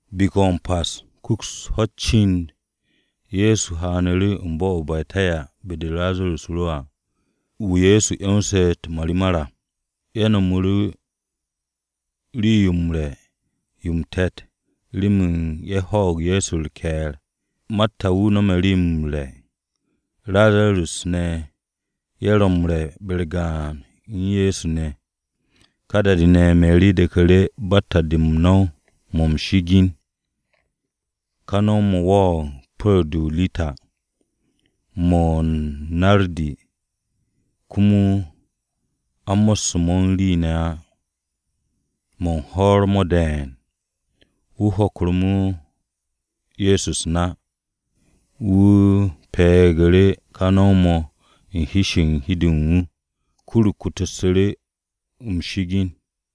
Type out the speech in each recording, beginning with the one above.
Biki-o̱ m-Pas kuks ho̱-u̱t cind, Ye̱so haanu̱ru̱ bo̱-o̱ o-Betanya be-de Razarus ro'e̱ à, wu̱ Ye̱so 'yonse̱ u̱t-marimar à. Ye̱ no̱mu̱ru̱ rii-yo m-re̱ yo m-te̱t remen ye̱ hwo̱o̱g Ye̱so u̱r-ke̱e̱r. Marta wu̱ no̱me̱ rii-yo m-re̱. Razarus ne̱ ye̱ ro m-re̱ be-u̱r gaan u̱n Ye̱so ne̱. Ka da-de ne̱, Meri de̱ku̱ru̱ batta-de u̱n no̱w-mo̱ m-shi'igin. Ka no̱w-mo̱ wo̱o̱g pu̱ru̱g-de o-rita, mo̱ o-nardi, komo a mo̱sse̱ mo̱ u̱n rii ne̱ á, mo̱ u̱n hwo̱r mo̱ de̱e̱n. Wu̱ hokmu̱ru̱ mo̱ Ye̱so u̱s-na, wu̱ pe̱'e̱gu̱ru̱ ka no̱w-mo̱ u̱n hi-se u̱n hi-de u̱n wu̱. Kur-o kutuksu̱ru̱ u̱n m-shi'igin.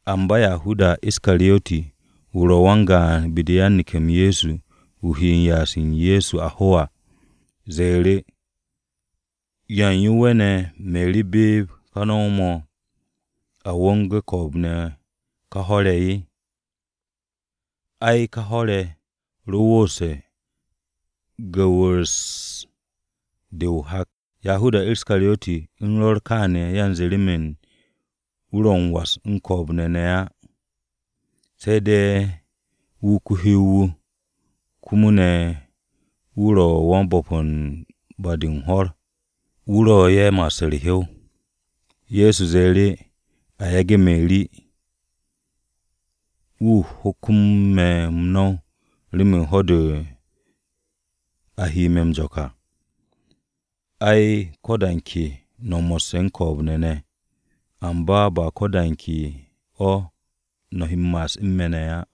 Amba Yahudas Iskariyoti, wu̱ ro wan-gaan be-de u̱n yan-neke̱-m Ye̱so wu̱ he m-ya'as u̱n Ye̱so a ho à. Wu̱ ze̱e̱ru̱, “¿Ya u̱n yo ne̱ we̱ne̱ Meri beeb ka no̱w-mo̱, a wo̱nge̱ ko̱o̱b-ne̱ ka hwo̱r-ye̱? Ai, ká hwo̱r-ye̱ ro wooste̱ gu̱wu̱s-de u̱n hak.” Yahudas Iskaryoti u̱n rwo̱r kááne̱ yanze remen wu̱ ro m-was u̱n ko̱o̱b-ne̱ ne̱ o̱ á, se̱ de̱ wu̱ ko-hyow-wu̱. Komo ne̱ wu̱ ro wan-bo̱p-to̱ u̱n ba-de u̱n hwo̱r, wu̱ ro ye̱ m-ma'as m-hiw. Ye̱so ze̱e̱ru̱, “A yage̱ Meri, wu̱ u̱n hokmo me̱ m-no̱w remen ho̱-de a he me̱ jo̱k à. Ai, ko̱ de ke da-de no̱ mo̱sse̱ u̱n ko̱o̱b-ne̱ ne̱, amba ba ko̱ da u̱n ke o̱ no̱ he m-ma'as u̱n me̱ ne̱ á.”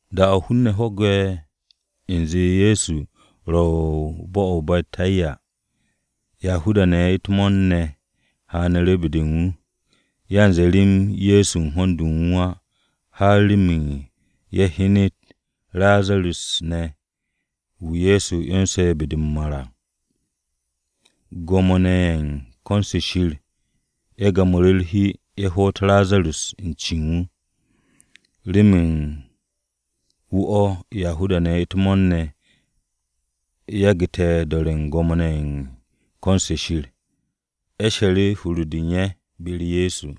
Da-o̱ hun-ne̱ ho̱gu̱te̱ u̱nze Ye̱so ro u̱n bo̱-o̱ o-Betanya, Yahuda-ne̱ u̱t-mo̱o̱r ne̱ ye̱ haanu̱ru̱ be-de u̱n wu̱. Yanze rem Ye̱so u̱n ho̱n-de u̱n wu̱ á, har remen ye̱ hyenet u̱n Razarus ne̱ wu̱ Ye̱so 'yonse̱ be-de m-mar à. Gwo̱mo-ne̱ ye̱ u̱n ko̱n-se Shir ye̱ gamu̱ru̱ u̱t-hi ye̱ hoot Razarus u̱n ce u̱n wu̱, remen u̱n wu̱ o̱ Yahuda-ne̱ u̱t-mo̱o̱r ne̱ yagu̱te̱ do̱re̱ u̱n gwo̱mo-ne̱ ye̱ u̱n ko̱n-se Shir. Ye̱ she̱re̱ hur-de u̱n ye̱ be-u̱r Ye̱so.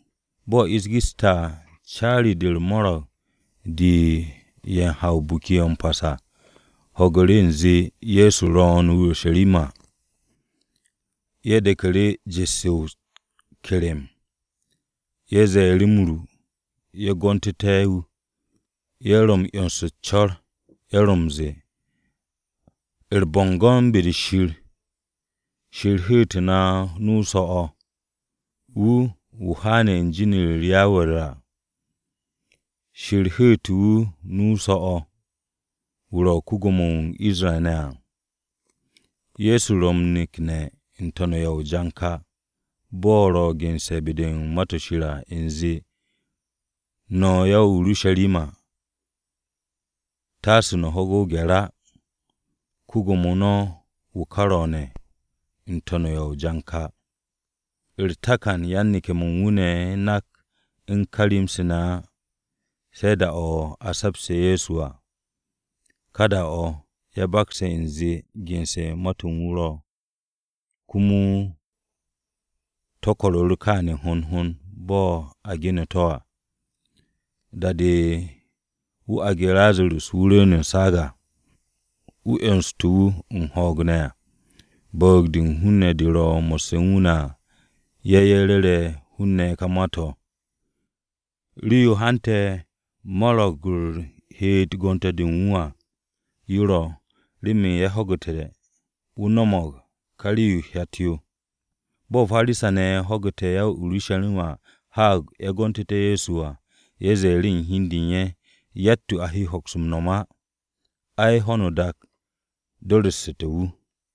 Bo̱ ish geste̱ à, caari-de u̱r-mo̱ro̱g de u̱n ye̱ ha ka Biki-o̱ m-Pas à, ho̱gu̱ru̱ u̱nze Ye̱so ro̱o̱n o-Urusharima. Ye̱ de̱knu̱ru̱ jet-se o-ke̱re̱m. Ye̱ ze̱e̱ru̱ m-ru ye̱ gontu̱te̱ wu̱, ye̱ ro u̱n 'yons u̱s-co̱r, ye̱ ro m-ze̱e̱, “U̱r-bo̱ngo̱n be-de Shir! Shir hu̱u̱te̱ wu̱ nu-o so̱-o̱ wu̱, wu̱ haane̱ u̱n be̱e̱b-u̱r Yawe à. Shir hu̱u̱te̱ wu̱ nu-o so̱-o̱ wu̱ ro̱ ko-Gwo̱mo-wu̱ u̱n Isra-ne̱ à!” Ye̱so ro m-nekne̱ n-to̱n u̱n ya o-janka bo̱ ro̱ gense̱ be-de u̱n Ma-to̱ Shir à u̱nze, “No̱ ya-o-Urusharima taase no̱ ho̱ge̱ o-gye̱r á, Ko-Gwo̱mo no̱ wu̱ ka ro̱o̱ne̱ n-to̱n u̱n ya o-janka.” U̱r-takan, yan-neke̱-mo̱ u̱n wu̱ ro nak u̱n kà rem-se ne̱ á, se̱ da-o̱ a se̱pse̱ Ye̱so à. Ká da-o̱, ye̱ bakse̱ u̱nze gense̱ ma-to̱ u̱n wu̱ ro̱, komo to̱ ko̱ru̱ru̱ kááne̱ hond hond bo̱ a ge̱ne̱ to̱ à. Da-de wu̱ aage̱ Razarus wu̱ rwu̱u̱n u̱n saag à, komo wu̱ 'yonstu̱ wu̱ u̱n ho̱o̱g ne̱ à, bu̱u̱g-de u̱n hun-ne̱ de ro mo̱sse̱ u̱n wu̱ ne̱ à, ye̱ ye̱ ru̱re̱ hun-ne̱ ka ma-to̱. Rii-yo hante̱ mo̱ro̱g-u̱r heet gonte̱ de u̱n wu̱ à yo ro̱, remen ye̱ ho̱gu̱te̱ wu̱ no̱mo̱g ká rii-yo u̱t-hyat yo. Bo̱ Parisa-ne̱ ho̱gu̱te̱ ya-o-Urusharima haag ye̱ gontu̱te̱ Ye̱so à, ye̱ ze̱e̱ru̱ hi u̱n de u̱n ye̱, “Yatt-yo a hokse̱ m-no̱m á! Ai, ho̱no o-dak do̱ru̱ssu̱te̱ wu̱!”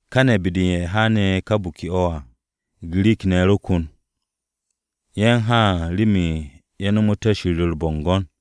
Káne̱, be-de u̱n ye̱ haane̱ ká biki-o̱ à Girik-ne̱ ro kon. Ye̱ u̱n haan remen ye̱ nomoté̱ Shir u̱r-bo̱ngo̱n.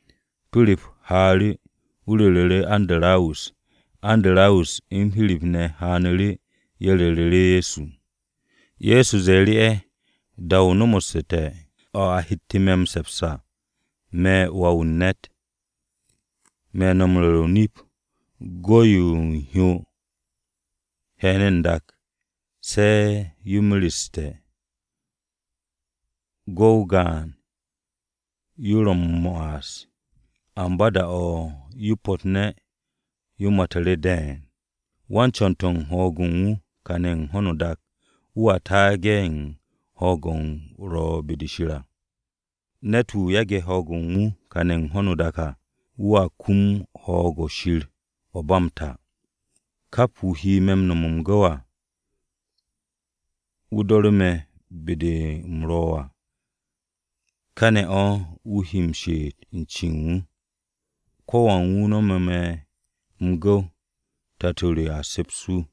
Pirip haaru̱, wu̱ ru̱ru̱ Andarawus. Andarawus u̱n Pirip ne̱ haanu̱ru̱, ye̱ ru̱ru̱ Ye̱so. Ye̱so ze̱e̱ru̱ ye̱, “Da-o nomoste̱ o̱ a hette̱ me̱ m-se̱ps à, me̱ Wà-wu̱ u̱n ne̱t. Me̱ no̱ m-ru̱re̱ o-nip, go̱-yo o-hyo he̱ne̱ n-dak se̱ yo mereste̱, go̱-o gaan-yo ro̱ m-ma'as. Amba da-o̱ yo po̱tne̱, yo matu̱ru̱ de̱e̱n. Wan-co̱n-to̱ u̱n ho̱o̱g-o̱ u̱n kàne̱ u̱n ho̱no o-dak, wu̱a taage̱ u̱n ho̱o̱g-o̱ ro̱ be-de Shir à. Ne̱t-wu̱ yage̱ ne̱ ho̱o̱g-o̱ u̱n kàne̱ u̱n ho̱no o-dak à, wu̱a kum ho̱o̱g-o̱ Shir o̱ ba m-ta. Kap wu̱ he me̱ nome̱ m-gu̱w à, wu̱ do̱ru̱ me̱ be-de u̱m ro̱ à, káne̱ o̱ wu̱ he m-she'et u̱n cen wu̱. Ko̱wan wu̱ nomo me̱ m-gu̱w, Tato re a se̱ps wu̱.”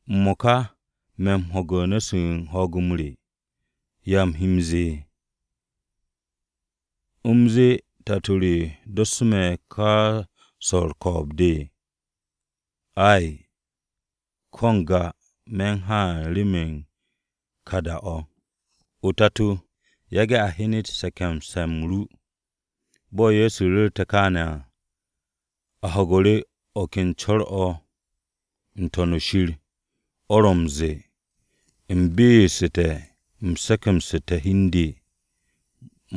“M-mo̱ka me̱ u̱n ho̱ge̱ u̱n nu̱-se u̱n ho̱o̱g re. ¿Ya u̱m he m-ze̱e̱? ¿U̱m zee ‘Tato re dossu̱ me̱ ka swo̱ u̱r-ko̱o̱b de’? Ay, ko̱ n-ga, me̱ u̱n haan remen ka da-o̱. O-Tato, yage̱ a hyenet se̱ke̱mse̱-m ru.” Bo̱ Ye̱so ru̱rte̱ kaane̱ à, a ho̱gu̱ru̱ o̱ ken co̱r-o̱ n-To̱n shir, o̱ ro̱ m-ze̱e̱, “U̱m be'essu̱te̱, u̱m se̱ke̱msu̱ssu̱te̱ hi u̱n de.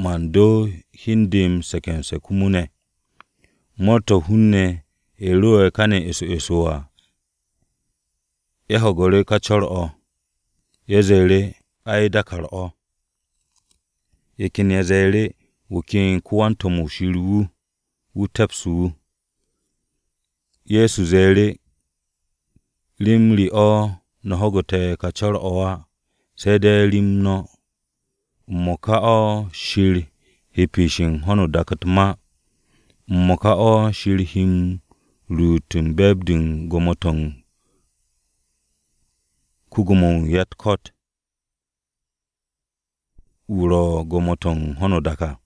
Man do hi u̱n de m-se̱ke̱mse̱ komo ne̱.” Mo̱o̱r-to̱ u̱n hun-ne̱ ye̱ ro kane̱ eso eso à, ye̱ ho̱gu̱ru̱ ka co̱r-o̱. Ye̱ ze̱e̱ru̱, “Ai, dàkàr-o̱.” Ye̱ ken ye̱ ze̱e̱ru̱, “Wu̱ ken ko-wan-to̱m-wu̱ Shir wu̱ wu̱ te̱psu̱ wu̱.” Ye̱so ze̱e̱ru̱, “Rem re o̱ no̱ ho̱gu̱te̱ ka co̱r-o̱ á, se̱ de̱ rem no̱. M-mo̱ka o̱ Shir he piishe̱ u̱n ho̱no o-dak u̱t-ma. M-mo̱ka o̱ Shir he m-ruut u̱n be̱e̱b-de u̱n gwo̱mo-to̱ ko-Gwo̱mo-wu̱ u̱n ya-u̱t-ko̱t wu̱ ro̱ gwo̱mo-to̱ u̱n ka ho̱no o-dak à.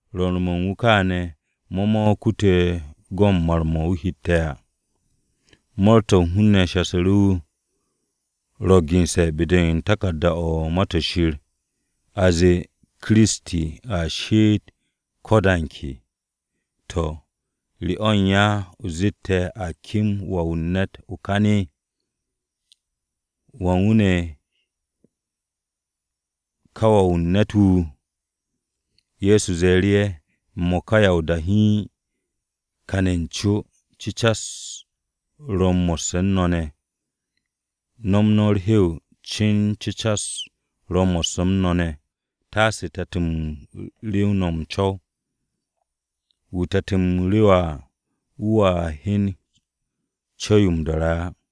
Rwo̱r-mo̱ u̱n wu̱ kááne̱ mo̱ mo̱ kute̱ go̱n mar-mo̱ wu̱ hette̱ à. Mo̱o̱r-to̱ u̱n hun-ne̱ shasu̱ru̱ wu̱, “Ro̱ gense̱ be-de u̱n Taku̱rda-o̱ u̱n Ma-to̱ Shir, a zee Kiristi a she'et ko̱ da u̱n ke. To̱, ¿re o̱ u̱n ya o zet ‘A kem Wà-wu̱ u̱n ne̱t o-kan?’ ¿Wan wu̱ ne̱ ka Wà-wu̱ u̱n ne̱t wu̱?” Ye̱so ze̱e̱ru̱ ye̱, “M-mo̱ka ya o-da hiin kane̱ u̱n co, cecas-m ro̱ mo̱sse̱ u̱n no̱ ne̱. Nom no̱ u̱r-hew cin cecas-m ro̱ mo̱sse̱ u̱n no̱ ne̱, taasu̱ te̱t-mo̱ rew no̱ n-co̱w. Wu̱ te̱t-m rewe̱ à, wu̱a hyen co̱w-yo m-do̱re̱ á.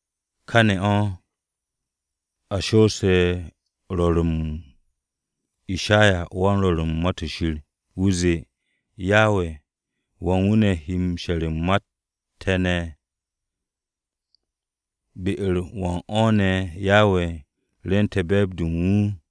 Káne̱ o̱, a shoose̱ rwo̱r-m Ishayawan-Rwo̱r u̱n Ma-to̱ Shir. Wu̱ zee, “Yawe, ¿wan wu̱ ne̱ she̱re̱ u̱n ma-u̱t te̱ ne̱? ¿Be-u̱r wan o̱ ne̱ Yawe rwu̱nte̱ be̱e̱b-de u̱n wu̱?”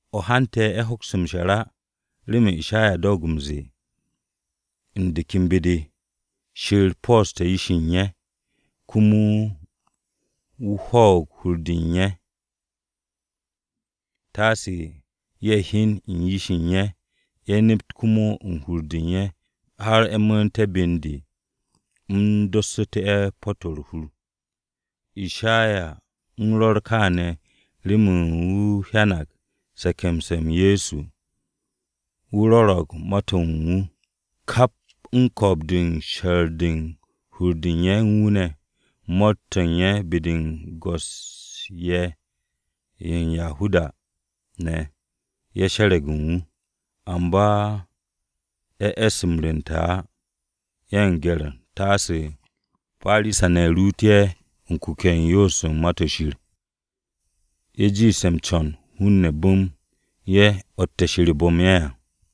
O̱ hante̱, ye̱ hokste̱ m-she̱r á remen Ishaya doog m-ze̱e̱, u̱n de ken be-de. “Shir po̱o̱ste̱ yish-ye̱ u̱n ye̱, komo wu̱ ho̱o̱g hur-de u̱n ye̱, taasu̱ ye̱ hyen u̱n yish-de u̱n ye̱, ye̱ nept komo u̱n hur-de u̱n ye̱, har ye̱ mu̱u̱nté̱ be u̱n de, u̱m dossu̱tu̱ ye̱ po̱-to̱ u̱r-hur.” Ishaya u̱n rwo̱r kááne̱ remen wu̱ hyanag se̱ke̱mse̱-m Ye̱so, wu̱ ro̱ro̱g ma-to̱ u̱n wu̱. Kap u̱n ko̱o̱b-de u̱n she̱r u̱n hur-de u̱n ye̱ u̱n wu̱ ne̱, u̱t-mo̱o̱r ne̱ be-de go̱s-ye̱ ye̱ u̱n Yahuda-ne̱, ye̱ she̱re̱g u̱n wu̱. Amba ye̱ e̱s m-rwu̱nte̱ á, u̱n gye̱r-o̱ u̱n taase Parisa-ne̱ ruut ye̱ u̱n kuke̱-o̱ u̱n yoos u̱n Ma-to̱ Shir. Ye̱ jiishte̱ m-co̱n hun-ne̱ bu̱m ye̱ o̱tte̱ Shir bu̱m ye̱ à.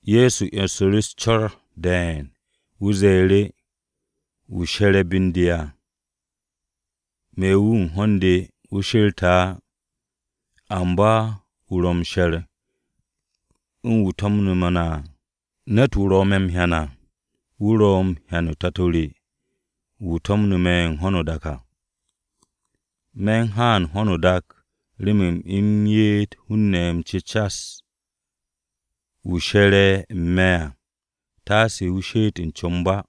Ye̱so 'yonsu̱ru̱ u̱s-co̱r de̱e̱n, wu̱ ze̱e̱ru̱, “Wu̱ she̱re̱ be u̱n de à, me̱ wu̱ u̱n ho̱n-de wu̱ she̱rte̱ á. Amba wu̱ ro̱ m-she̱r u̱n wu̱ to̱mnu̱ me̱ ne̱ à. Ne̱t-wu̱ ro̱ me̱ m-hyan à, wu̱ ro̱ m-hyan u̱n Tato re wu̱ to̱mne̱ me̱ u̱n ho̱no o-dak à. Me̱ u̱n haan ho̱no o-dak remen u̱m ye'et hun-ne̱ m-cecas. Wu̱ she̱re̱ u̱n me̱ ne̱ à, taase wu̱ she'et o-comb á.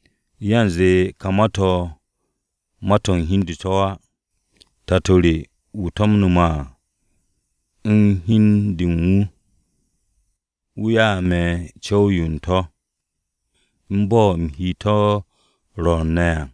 Yanze ka ma-to̱, ma-to̱ u̱n hi u̱n de to̱ á. Tato re wu̱ to̱mne̱ me̱ à, u̱n hi u̱n de u̱n wu̱, wu̱ ya'e̱ me̱ co̱w-yo u̱n to̱, u̱n bo̱ u̱m he to̱ m-rwo̱r ne̱ à.